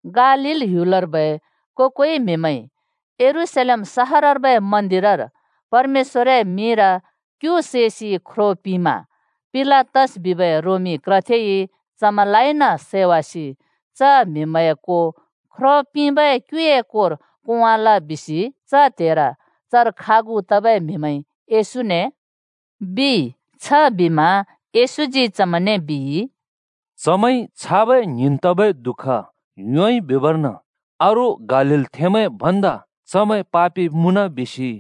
“गालील ह्‍युलर्बै को-कोइ म्हिमैंइ यरूशलेम सहरर्बै मन्दिरर परमेश्‍वरए मिंर क्‍यु सैसि ख्रो पिंमा पिलातस बिबै रोमी क्रथेइ चमैंलाइन सैवासि च म्‍हिमैंए को ख्रो पिंबै क्‍युए कोर कोंवाल बिसि च त्‍हेर चर खागु तबै म्हिमैंइ येशूने,” बिइ। छबिमा येशूजी चमैंने बिइ, “चमैंइ छाबै ङ्हिंन् तबै दुःख योंइ बिबर्न अरू गालीलथेंमैं भन्दा चमैं पापि मुँन बिसि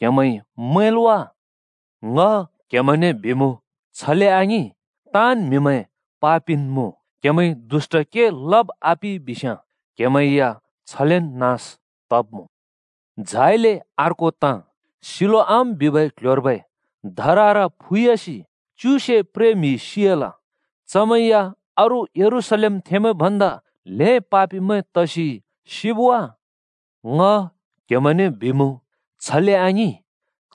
क्हेमैंइ मैंल् वा? ङ क्‍हेमैंने बिमुँ, छले आङिं। ताँन् म्‍हिमैं पापिन् मुँ। क्‍हेमैंइ दुष्‍ट के लब् आपिइ बिस्‍याँ क्‍हेमैं या छलेन् नास तब्‍मुँ। झाइले अर्को ताँ, सिलोआम बिबै क्ल्ह्‍योर्बै धरर फुयासि च्युसे प्रे म्‍हि सि‍याल। चमैं या अरू यरूशलेमथेंमैं भन्दा ल्हें पापिमैं तसि सिब् वा? ङ क्‍हेमैंने बिमुँ, छले आङिं,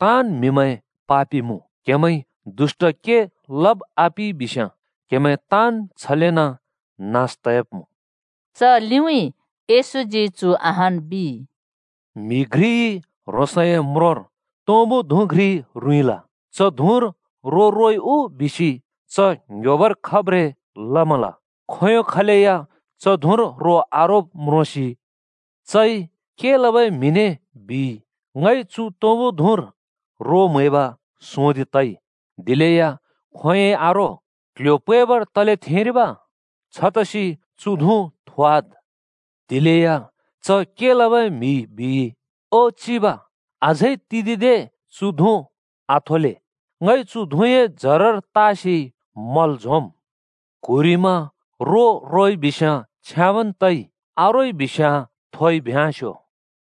ताँन् म्‍हिमैं पापि मुँ। क्‍हेमैंइ दुष्‍ट के लब् आपिइ बिस्‍याँ क्‍हेमैं ताँन् छलेन् नास तब्‍मुँ।” च लिउँइँ येशूजी चु अहान् बिइ, “म्‍हि घ्रिइ ह्रोंसए म्रोंर तुँबु धुँ घ्रि रुँइँल। च धुँर रो रोइ उ बिसि च ङ्‍ह्‍योबर खब्ब्रें लमल। खोंयों खलैया च धुँर रो आरोब् म्रोंसि चइ के लबै म्हिने ‘ङइ चु तुँबु धुँर रो म्‍हैब सोंदिं तइ, दिलेया खोंयोंइ रो आरो। क्ल्ह्‍यो पैबर तले थेंरिब? छतसि चु धुँ थोवाद्,’ बिइ। “दिलेया के लबै म्हिइ बिइ, ‘ओ चिब, अझै तिदिंदे चु धुँ आथोले। ङइ चु धुँए जरर तासि मला झोंम्। क्‍हुरिमा रो रोइबिस्‍याँ छ्याँबन् तइ, आरोइ बिस्‍याँ थोइ भ्योंवाले।’”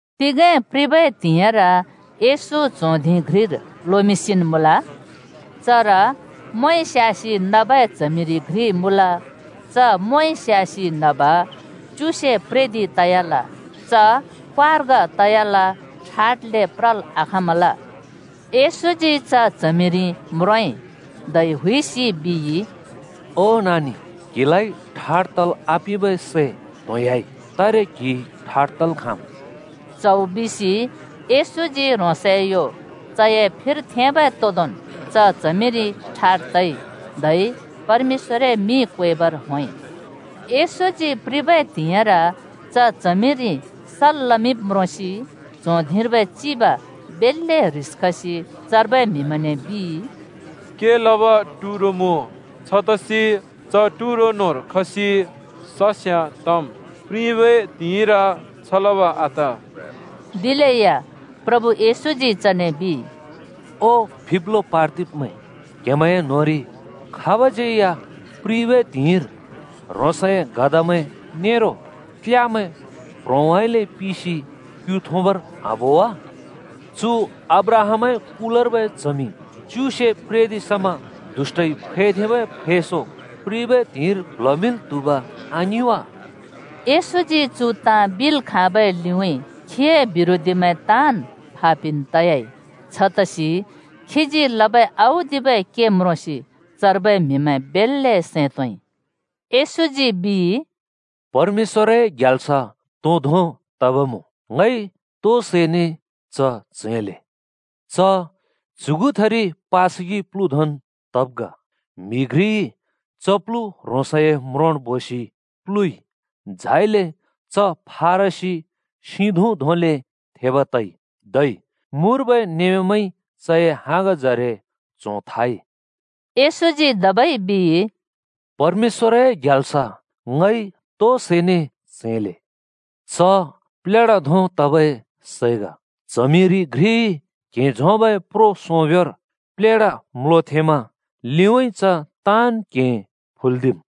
तिगें प्रिबै त्हिंइर येशू च्हों धिं घ्रिर लोमिंसिन् मुँल। चर मोंइ स्‍यासि नबै च्हमिरि घ्रि मुँल। च मोंइ स्यासि नब च्युसे प्रेदिं तयाल। च क्वार्ग तयल, ठाड्ले प्रल् आखाँमल। येशूजी च च्हमिरि म्रोंइ, धै हुइसि बिइ। “ओ नानि, क्‍हिलाइ ठाड् तल् आपिंबै सै त्होंयाँइ, तारे क्हि ठाड् तल् खाँम्।” च्हौ बिसि येशूजी ह्रोंसए यो चए फिर थेंबै तोदोंन् च च्हमिरि ठाड् तइ धै परमेश्‍वरए मिं क्वेबर होंइ। येशूजी प्रिबै त्हिंइर च च्हमिरि सल् लमिंब् म्रोंसि च्हों धिंर्बै चिब बेल्‍ले ह्रिस खसि चर्बै म्‍हिमैंने बिइ, “के लब टुरो मुँ, छतसि च टुरो न्‍होंर खसि सस्याँ तम्। प्रिबै त्हिंइर छ लब आत।” दिलेया प्रभु येशूजी चने बिइ, “ओ फिब्लो पार्दिब्‍मैं! क्‍हेमैंए न्होंरि खाबज्यै या प्रिबै त्हिंइर ह्रोंसए गधामैं नेरो क्‍ल्‍यामैं प्ह्रोंउँइँले पिसि क्‍यु थुँबर आबो वा? चु अब्राहामए कुलर्बै च्हमि च्युसे प्रेदिं समा दुष्‍टइ फैथेंबै फैंसों प्रिबै त्हिंइर प्ल्हमिंल् त्हुब् आङिं वा? येशूजी चु ताँ बिल् खाँबै लिउँइँ खीए बिरोधीमैं ताँन् फापिन् तयाइ। दिलेया खीजी लबै औदिबै के म्रोंसि चर्बै म्हिमैं बेल्‍ले सैं तोंइ।” येशूजी बिइ, “परमेश्‍वरए ग्याल्स तो धों तब मुँ? ङइ तो सैने च च्‍हैंले? च च्‍युगुथिरि पासगि प्‍लु धोंन् तब् ग। म्‍हि घ्रिइ च प्‍लु ह्रोंसए म्रोंर बोसि प्‍लुइ। झाइले च फारसी सिं धुँ धोंले थेब तइ। धै मुर्बै नमेमैंइ चए हाँगजरे च्‍हों थाइ।” येशूजी धबै बिइ, “परमेश्‍वरए ग्याल्स ङइ तो सैने च्‍हैंले? च प्लेढा धों तबै सै ग। च्हमिरि घ्रिइ क्हें झोंबै प्रो सोंब्‍योंर प्लेढा म्‍लोथेंमा लिउँइँ च ताँन् क्हें फुल्दिम्।”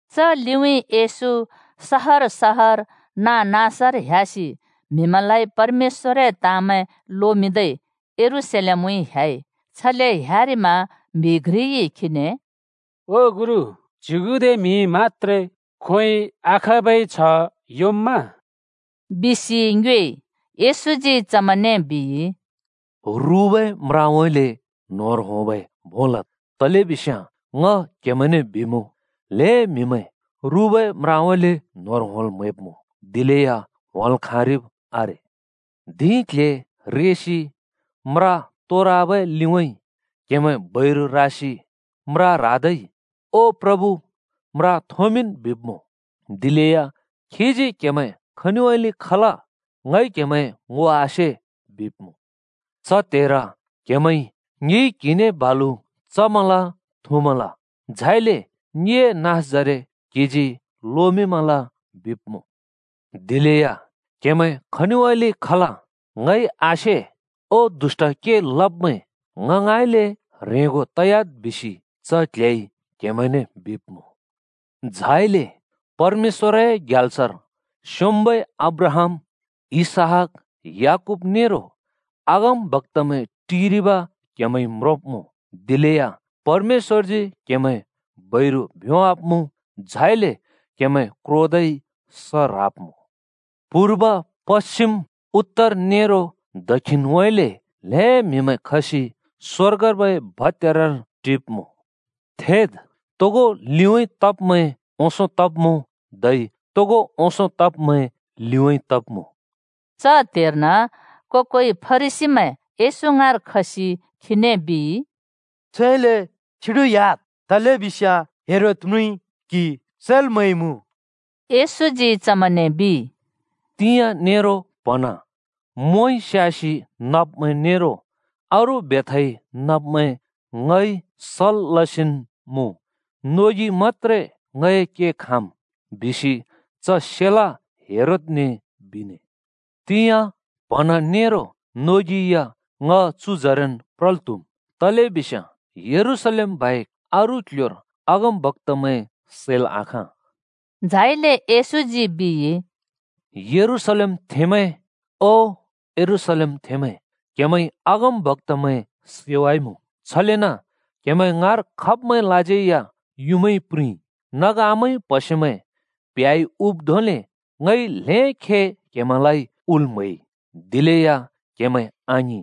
च लिउँइँ येशू सहर सहर नाँ-नाँसर ह्‍यासि म्हिमैंलाइ परमेश्‍वरए ताँमैं लोमिंदै यरूशलेमउँइँ ह्‍याइ। छले ह्‍यारिमा म्‍हि घ्रिइ खीने “ओ गुरु, च्युगुदे म्हिइ मत्‍त्रे खोंयोंइ आखाँबै छ्ह योंम्मा?” बिसि ङ्योएइ। येशूजी चमैंने बिइ, “रुबै म्राउँइँले न्‍होंर होंबै भों लद्, तलेबिस्याँ ङ क्‍हेमैंने बिमुँ, ल्‍हें म्‍हिमैं रुबै म्राउँइँले न्‍होंर होंल् म्‍हैब्‍मुँ, दिलेया होंल् खाँरिब् आरे। धिं क्‍ल्‍हे रेसि म्रा तोरवाबै लिउँइँ क्‍हेमैं बैरु रासि म्रा ह्रादै ‘ओ प्रभु, म्रा थोंमिंन्,’ बिब्‍मुँ, दिलेया खीजी ‘क्‍हेमैं खनिउँइँले खल ङइ क्‍हेमैं ङो आसे,’ बिब्मुँ। “च त्हेर क्‍हेमैंइ ‘ङिइ क्‍हिने बालु चमल थुँमल। झाइले ङिए नाँसजरे क्हिजी लोमिंमल,’ बिब्मुँ। “दिलेया ‘क्हेमैं खनिउँइँले खल ङइ आसे। ओ दुष्‍ट के लब्मैं, ङ ङाँइँले ह्रेंगो तयाद् बिसि च क्‍ल्‍हेइ क्‍हेमैंने,’ बिब्मुँ। “झाइले परमेश्‍वरए ग्याल्सर स्‍योंम्‍बै अब्राहाम, इसहाक, याकूब नेरो अगमबक्‍तामैं टिरिब क्‍हेमैंइ म्रोंब्‍मुँ। दिलेया परमेश्‍वरजी क्‍हेमैं बैरु भ्योंवाब्‍मुँ, झाइले क्हेमैं क्रोदै स ह्राब्मुँ। पूर्व, पश्‍चिम, उत्तर नेरो दक्षिणउँइँले ल्‍हें म्‍हिमैं खसि स्‍वर्गर्बै भत्‍यारर टिब्‍मुँ। थेद्! तोगो लिउँइँ तब्मैं ओंसों तब्‍मुँ, धै तोगो ओंसों तब्मैं लिउँइँ तब्मुँ।” च त्‍हेर्न को-कोइ फरिसीमैं येशू ङाँर खसि खीने बिइ, “छुइले छ्युडिह्‍याद् तलेबिस्याँ हेरोद म्रुँइ क्‍हि सैल् म्‍हैइमुँ।” येशूजी चमैंने बिइ, “‘तिंयाँ नेरो प्‍हँना मोंइ स्‍यासि नब्मैं नेरो अरू बेथाइ नब्‍मैं ङइ सल् लसिन् मुँ, नोगि मत्‍त्रे ङए के खाँम्’ बिसि च सेला हेरोदने बिने। ‘तिंयाँ, प्‍हँना नेरो नोगि या ङ‍ चु जरेन् प्रल् त्हुम्। तलेबिस्याँ यरूशलेम बाहेक अरू क्ल्ह्‍योर अगमबक्‍तामैं सैल् आखाँ।’” झाइले येशूजी बिइ, “यरूशलेमथेंमैं, ओ यरूशलेमथेंमैं, क्‍हेमैंइ अगमबक्‍तामैं सैवाइमुँ, छलेन क्हेमैं ङाँर खब्मैंलाज्यै या युँमाइ प्रिंइ। नग आमाइ प्हसेमैं प्‍ह्‍याइ हुब् धोंले ङइ ल्‍हें खे क्‍हेमैंलाइ हुल् म्हैइ, दिलेया क्‍हेमैं आङिं।